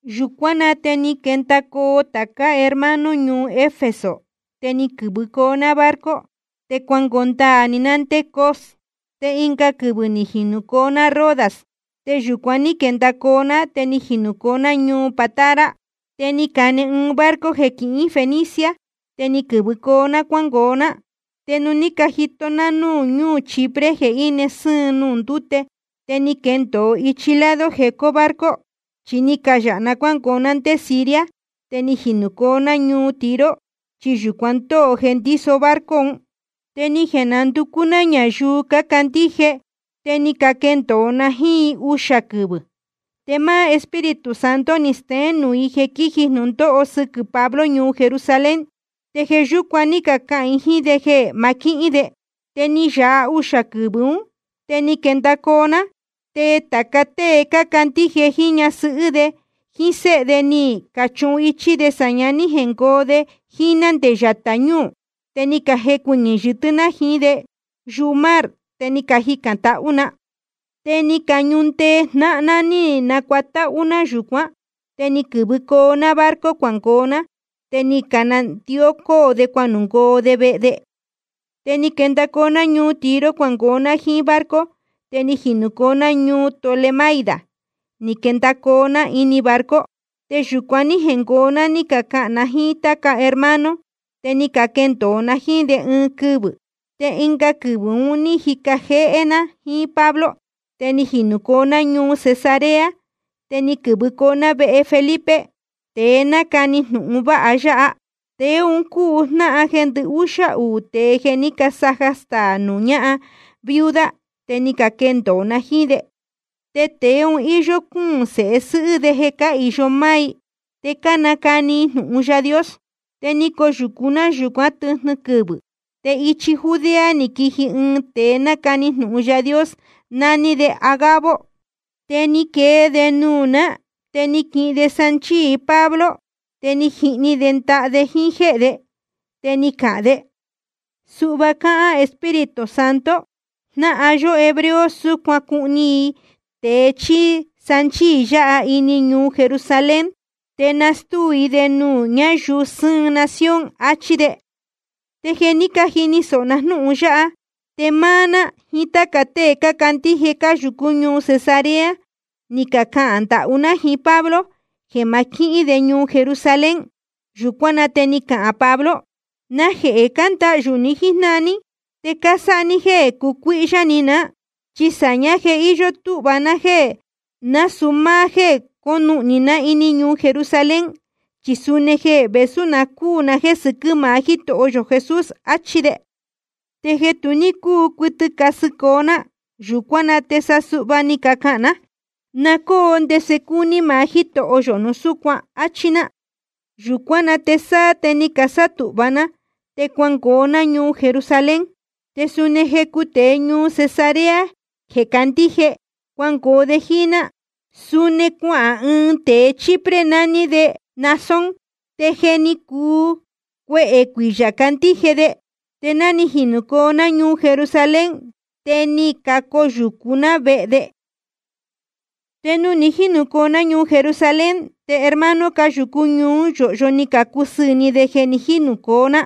Yūcuán na te ni caquendōo tācá hermano ñuu Efeso, te ni quɨ̄vɨcoo ná barco, te cuangoo ndaā‑ni ná ndé Cos. Te ɨnga quɨvɨ̄ ni jinūcoo ná Rodas, te yūcuan ní quendacoo ná te ni jinūcoo ná ñuu Pátara. Te ni cane ɨɨn barco jeē quihín Fenicia, te ni quɨ̄vɨcoo ná cuángoo ná. Te nuū ní cajito ná núū Chipre jeē íne sɨ́ɨn nuū ndúte, te ni quendōo ichi lado jecó barco, chi ni cayāha ná cuángoo ná nde Siria. Te ni jinūcoo ná ñuu Tiro, chi yūcuan ndóo jeē ndíso barco ún. Te ni jenanducú ná ñayuu cácandíje, te ni caquendōo ná jíín i uxā quɨvɨ̄. Te máá Espíritu Santo ni steén nuū i jeē quíji jnūndóho sɨquɨ̄ Pablo ñuu Jerusalén, te jeē yúcuan ní cacahān i jíín de jeē ma quihín de. Te ni yāha uxā quɨvɨ̄ ún, te ni quendacoo ná. Te tāca tée cácandíje jíín ñasɨhɨ́ de jíín séhe de ni cachuhun ichí de sāña ní jengoo de jíín ná nde yatā ñúū, te ni cajecuɨñɨ̄ yɨtɨ́ ná jiín de yumar te ni cajicān tahú na. Te ni cañunundee jnáhan ná ní canacuatáhú ná yūcuán, te ni quɨ̄vɨcoo ná barco cuangoo ná. Te ni canandió cóo de cuanungoo de vehe de. Te ni quendacoo ná ñuu Tiro cuangoo ná jíín barco, te ni jinūcoo ná ñuu Tolemaida ni quendacoo ná ini barco. Te yūcuan ní jengoo ná ní cacahān na jíín táca hermano, te ni caquendōo ná jíín de ɨɨn quɨvɨ̄. Te ɨnga quɨvɨ̄ un ní cajica jéhé ná jiín Pablo, te ni jinūcoo ná ñuu Cesarea, te ni quɨ̄vɨcoo ná vehe Felipe, tēe nácani jnūhun vāha ya. Tēe un cúu jnáhan jeē ndɨhúxá tēe jeē ní casaja staā nuū ñáhan viuda. Te ni caquendōo ná jíín de. Te tēe un íyó cúūn sēhe sɨ́hɨ́ de jeē cáhīyo máá i, te cánacani i jnūhun Yaā Dios. Te ni coyūcu ná yūcuán tɨjnɨ quɨvɨ̄. Te ichi Judea ni quiji ɨɨn tēe nácani jnūhun Yaā Dios, nání de Agabo. Te ni quee de nuū ná. Te ni quihin de sanchíi Pablo, te ni jihni de ndaha de jíín jéhē de, te ni cahān de: Suhva cáhán Espíritu Santo. Jnáhan yó hebreo súcuan cuhni i tēe chíí sanchíi yáha ini ñuu Jerusalén, te nastúu i de nuū ñáyuu sɨ́ɨn nación, áchí de. Te jeē ní cajini sōho na jnúhun yáha te máá ná jiín táca tée cácandíje cáyūcú ñuu Cesarea ni cacahān ndahú ná jiín Pablo jeē ma quihín de ñuu Jerusalén. Yūcuán na te ni cahān Pablo: ¿Najehē cándahyū ni jíjnáhan ní, te cásáha ní jéē cucuíhyá ni ná? Chi sāñá je íyó túhva ná jéē násūu máá jéē cónuhnī ná ini ñuu Jerusalén, chi suni jeē vēsú na cúū na jéē sɨquɨ́ maá Jítoho yō Jesús, áchí de. Te jeē tu ní cúu cuɨtɨ casɨcoo ná, yūcuán na te sa suhva ni cacahān ná: Na cóo ndese cúní maá Jítoho yō nuu súcuan, áchí ná. Yūcuan na te sáá te ni casátūhva ná, te cuangoo ná ñuu Jerusalén. Te suni jecu tēe ñuu Cesarea jeē cácandíje cuangoo de jíín ná. Suni cuahān ɨɨn tēe Chipre nání de Mnasón, te je ni cuu cuehē cuiyā candíje de. Te ná ni jinūcoo ná ñuu Jerusalén, te ni cacoyūcu ná vehe de. Te nuū ni jínūcoo ná ñuu Jerusalén, te hermano cáyūcú ñuu ún yōhyo ni cacusɨɨ̄ ni de jeē ni jínūcoo ná.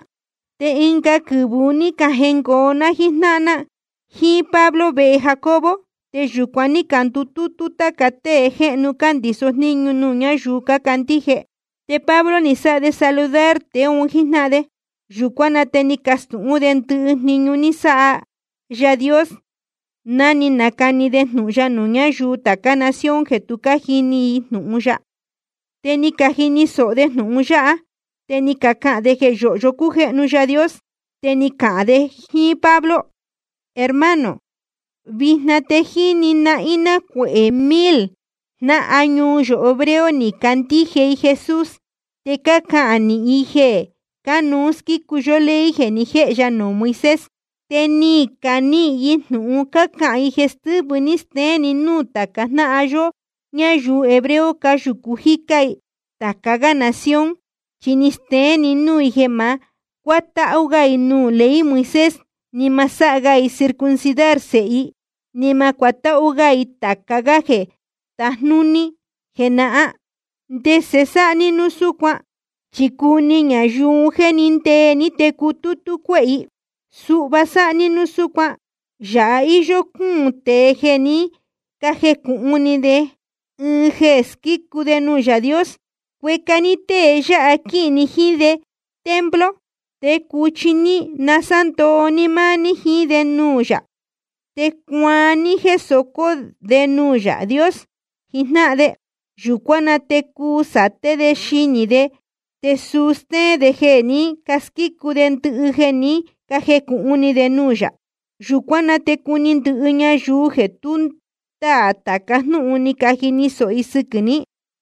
Te ɨnga quɨvɨ̄ un ní cajengoo ná jíjnáhan ná jiín Pablo vehe Jacobo, te yūcuan ní candutútú táca tée jéhnu cándīso jníñu nuū ñáyuu cácandíje. Te Pablo ni sáha de saludar tēe ún jíjnáhan de. Yūcuán na te ni castūhún de ndɨhɨ jniñu ní sáha Yaā Dios ná ni nacani de jnūhun ya nuū ñáyuu tācá nación jeē tu cájini i jnūhun ya. Te ni cajini sōho de jnūhun yáha, te ni cacahān de jeē yóhyo cújéhnu Yaā Dios. Te ni cacahān de jíín Pablo: Hermano, vijna te jíní ni náa cuehē mil jnáhan ñuu yō hebreo ni cacandíje i Jesús, te cácahān nīhin i jeē cánuú squícu yó ley jeē ni jéhe ya nuū Moisés. Te ni canihīn i jnūhun cácahān jeē stɨ́vɨ ní steén ni núū tāca jnáhan yó ñáyuu hebreo cáyūcu jícá i tāca gá nación, chi ni steén ni núū i jeē ma cuatáhú gá i nuū ley Moisés, ni ma sáha ga i circuncidar sēhe i, ni ma cuatáhú gá i tāca gá jeē tajnúní jenahán. ¿Ndese sáha ní núu súcuan? Chi cuni ñayuu un jéē ní ndee ní te cutútú cuéhē i. Suhva sáha ní núu súcuan. Yāha íyó cúūn tēe jeē ní cajejnūhun de ɨɨn jeē squícu de nuū Yaā Dios. Cueca ní tée yáha quíhīn ni jíín de templo, te cuchi ní nasándoo ní máá ní jiín de nuū yā, te cuaan ní jeē socó de nuū Yaā Dios jijnáhan de. Yūcuán na te cuu sāté de xinī de, te suu stéén jeē ní casquícu de ndɨhɨ jeē ní cajejnūhun de nuū yā. Yūcuán na te cuni ndɨhɨ ñayuu jeē tú ndaā tāca jnúhun ni cajini sōho i sɨquɨ̄ ní,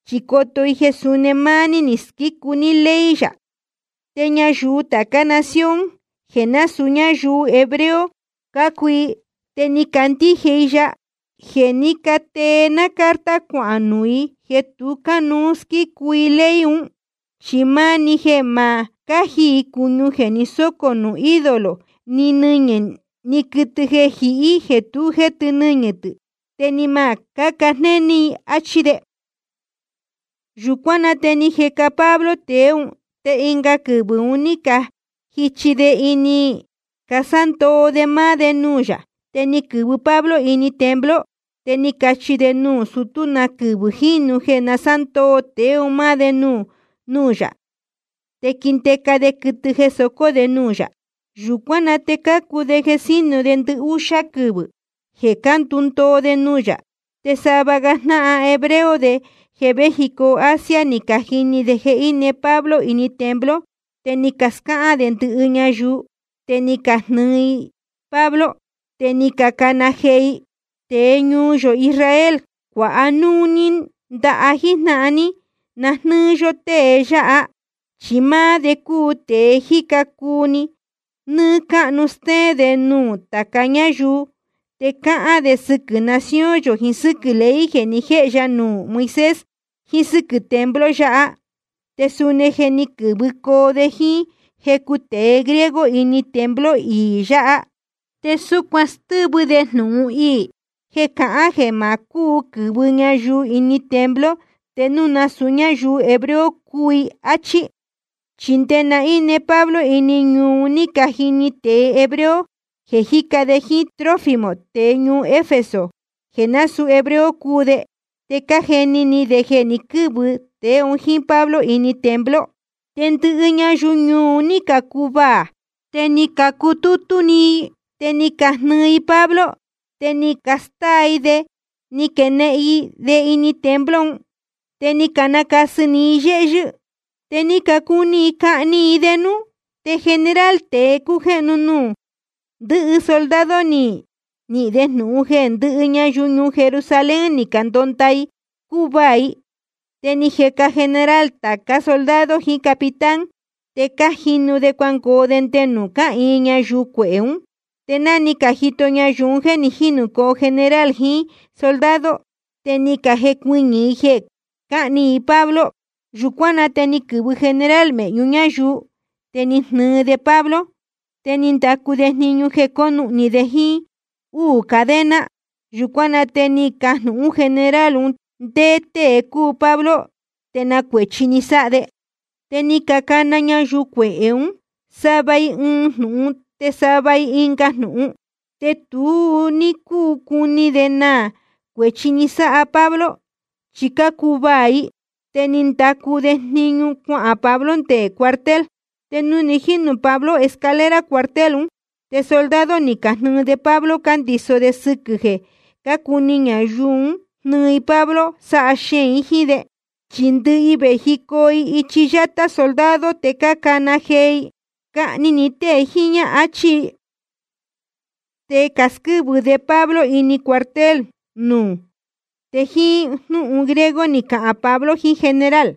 chi coto i jeē suni máá ní sa squícu ní ley yā. Te ñayuu tācá nación jeē násūu ñáyuu hebreo cácuu i te ni cacandíje i ya, je ni catee ná carta cuahān nuū i jeē tu cánuú squícu i ley un, chi máá‑ni jeē ma cáji i cūñu jeē ni sóco nuū ídolo ni nɨñɨ̄ ni quɨtɨ jeē jihí jeē tu jétɨ nɨñɨ̄ tɨ̄, te ni ma cáca jnéní i, áchí de. Yūcuán na te ni jeca Pablo tēe ún, te ɨnga quɨvɨ̄ un ní cajichi de ni canasándoo de máá de nuū yā. Te ni quɨ̄vɨ Pablo ini templo ni cachi de nuū sutú na quɨvɨ̄ jínu jeē nasándoo tēe un máá de nuū yā, te quindeca de quɨtɨ jeē socó de nuū yā. Yūcuán na te cácuu de jeē sínu de ndɨhúxá quɨvɨ̄ jeē cándundoo de nuū yā, te sava jnáhan hebreo de jeē véjicoo Asia ni cajini de jeē íne Pablo ini templo, te ni cascáhán de ndɨhɨ ñayuu, te ni cajnɨɨ i Pablo. Te ni cacana jee i: Tēe ñuu yō Israel, cuāha núú ní ndaha jíjnáhan ní na jnɨ́ɨ yó tée yáha. Chi máá de cúu tēe jíca cuu nɨ́ɨ́ cáhnu stéén de nuū tāca ñáyuu, te cáhán de sɨquɨ̄ nación yō jiín sɨ́quɨ̄ ley jeē ni jéhe ya nuū Moisés jiín sɨ́quɨ̄ templo yáha. Te suni je ni quɨ̄vɨcoo de jíín jecu tēe griego ini templo iī yāhá, te súcuan stɨ́vɨ de jnūhun iī jeē cahán jeē ma cúu quɨ̄vɨ ñayuu ini templo te núu nasūu ñáyuu hebreo cúu i, áchí. Chi nde na íne Pablo ini ñuu un ní cajini tēe hebreo jeē jíca de jíín Trófimo, tēe ñuu Efeso jeē násūú hebreo cúu de, te cájeni ni de jeē ni quɨ́vɨ tēe un jíín Pablo ini templo. Te ndɨhɨ ñayuu ñuu un ní cuvaā, te ni cacutútú‑ni i, te ni cajnɨɨ i Pablo, te ni castáa i de ni quenehen i de ini templo un, te ni canacasɨ‑ni i yéhyɨ́. Te ni cacuni i cahni i de núú. Te general, tēe cújéhnu nuū ndɨ́hɨ soldado, ni nihīn de jnūhun jeē ndɨhɨ ñayuu ñuu Jerusalén ni candonda i cácuvaā i. Te ni jeca general tācá soldado jiín capitán, te cájinu de cuangoo de nde nuū cáhīin ñayuu cuehē ún. Te ná ni cajito ñayuu jeē ni jínūcoo general jiín soldado, te ni cajecuɨñɨ̄ i jeē cácani i Pablo. Yūcuán na te ni quɨ̄vɨ general mēhñu ñáyuu, te ni jnɨɨ de Pablo, te ni ndacu de jniñu jeē conuhnī de jíín úū cadena. Yūcuán na te ni cajnūhún general ndé tée cúu Pablo te na cuēchi ni sáha de. Te ni cacana ñayuu cuehē ún, sava i ɨɨn jnūhun te sava ga i ɨnga jnūhun, te tu ní cúu cuni de na cuēchi ni sáha Pablo, chi cácuvaā i. Te ni ndacu de jniñu cuahān Pablo nde cuartel. Te nuū ni jínū Pablo escalera cuartel ún, te soldado ni cajnɨɨ de Pablo cándīso de sɨquɨ̄ jeē cácuni ñayuu ún jnɨɨ i Pablo sáha xeēn i jíín de. Chi ndɨhɨ i vējicoo i ichi yátá soldado, te cácana jee i: Cahni ni tée jíñá, achí i. Te cásquɨ́vɨ de Pablo ini cuartel nuú, te jíín jnúhun griego ni cahān Pablo jiín general: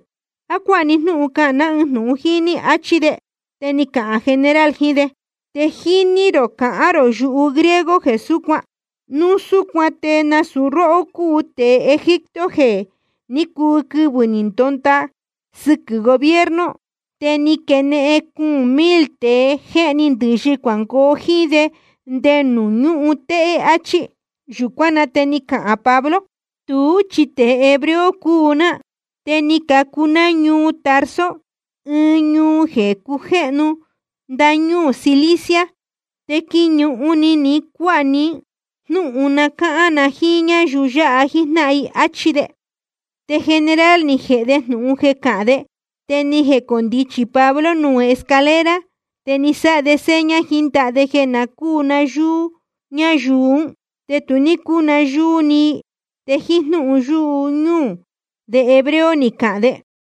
¿A cuáha ni jnúhun cahān ná ɨɨn jnūhun jíín ní? achí de. Te ni cahān general jiín de: Te jíní rō cahán rō yuhu griego jeē súcuan. Núu súcuan te nasūu róhó cúu tēe Egipto jeē jé ni cuu quɨvɨ̄ ni ndonda sɨquɨ̄ gobierno te ni quenehen cuūn mil tēe jéhni ndɨ̄yɨ cuangoo jíín de nde nuū ñúhun téhé, áchí. Yūcuán na te ni cahān Pablo: Tuú, chi tēe hebreo cúu ná, te ni cacu ná ñuu Tarso, ɨɨn ñuu jeē cujéhnu ndañúū Cilicia. Te quiñūhun ni ni cuáha ní jnúhun na cáhán na jíín ñáyuu yáha jíjnáhan i, áchí de. Te general ni jēhe de jnūhun jeē cahān de. Te ni jecondichi Pablo nuū escalera, te ni sáha de seña jiín ndaha de jeē na cúu nayúú ñáyuu ún. Te nuū ní cuu nayúú‑ni i, te jíín jnúhun yuhu ñúū de hebreo ni cahān de: